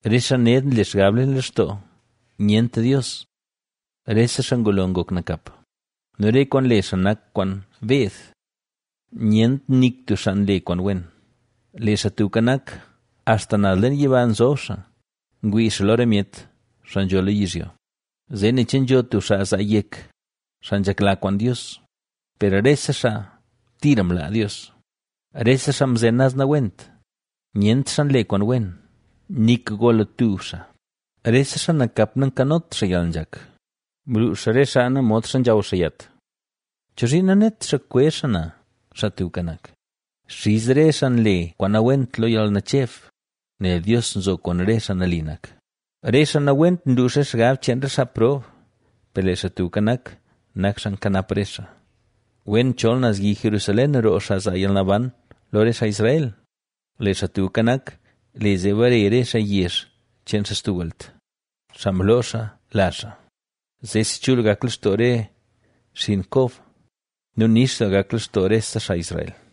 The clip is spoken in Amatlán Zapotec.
Re xaa ned nle xgab leen lextoo: “Nyent Dios.” Rese xaa ngulo ngok nakap nu re kwaan nle xaa nak kwaan beed. ¡Nyent nik tub xaa nle kwaan wen! Lee Xaa Tubka Nak, axta naz leen yiba nzob xaa, ngwii xaa lo re myet, xaa nzho lo yizhyo, zee ne che nzho tub xaa zaa yek, xaa nzhekla kwaan Dios. Per rese xaa tira mlaa Dios, rese xaa mzen naz nawent, nyent xaa nle kwaan wen. ¡Nik gola tub xaa! Rese xaa nakap nankanot xaa yalnzhak, nluux xaa re xaa na, modxa nzhaw xaa yat. ¿Chozhiin nanet xaa kwezh xaa na, Xaa Tubka Nak? Xiz re xaa nle kwaan nawent lo yalnacheb, nel Dios nzo kwaan re xaa nali nak. Re xaa nawent nluux re xgab cheen re xaa prob, per lee Xaa Tubka Nak, nak xaa nkanap re xaa. Wen chol naz yi Jerusalén roo xaa zaa yalnaban lo re xaa Israel, lee Xaa Tubka Nak, le zee bare re xaa yezh cheen xaa stub welt, xaa mloo xaa lazh xaa; ¡zeesi chul gak lextoo re xinn Kob nu nix doo gak lextoo rese xaa Israel!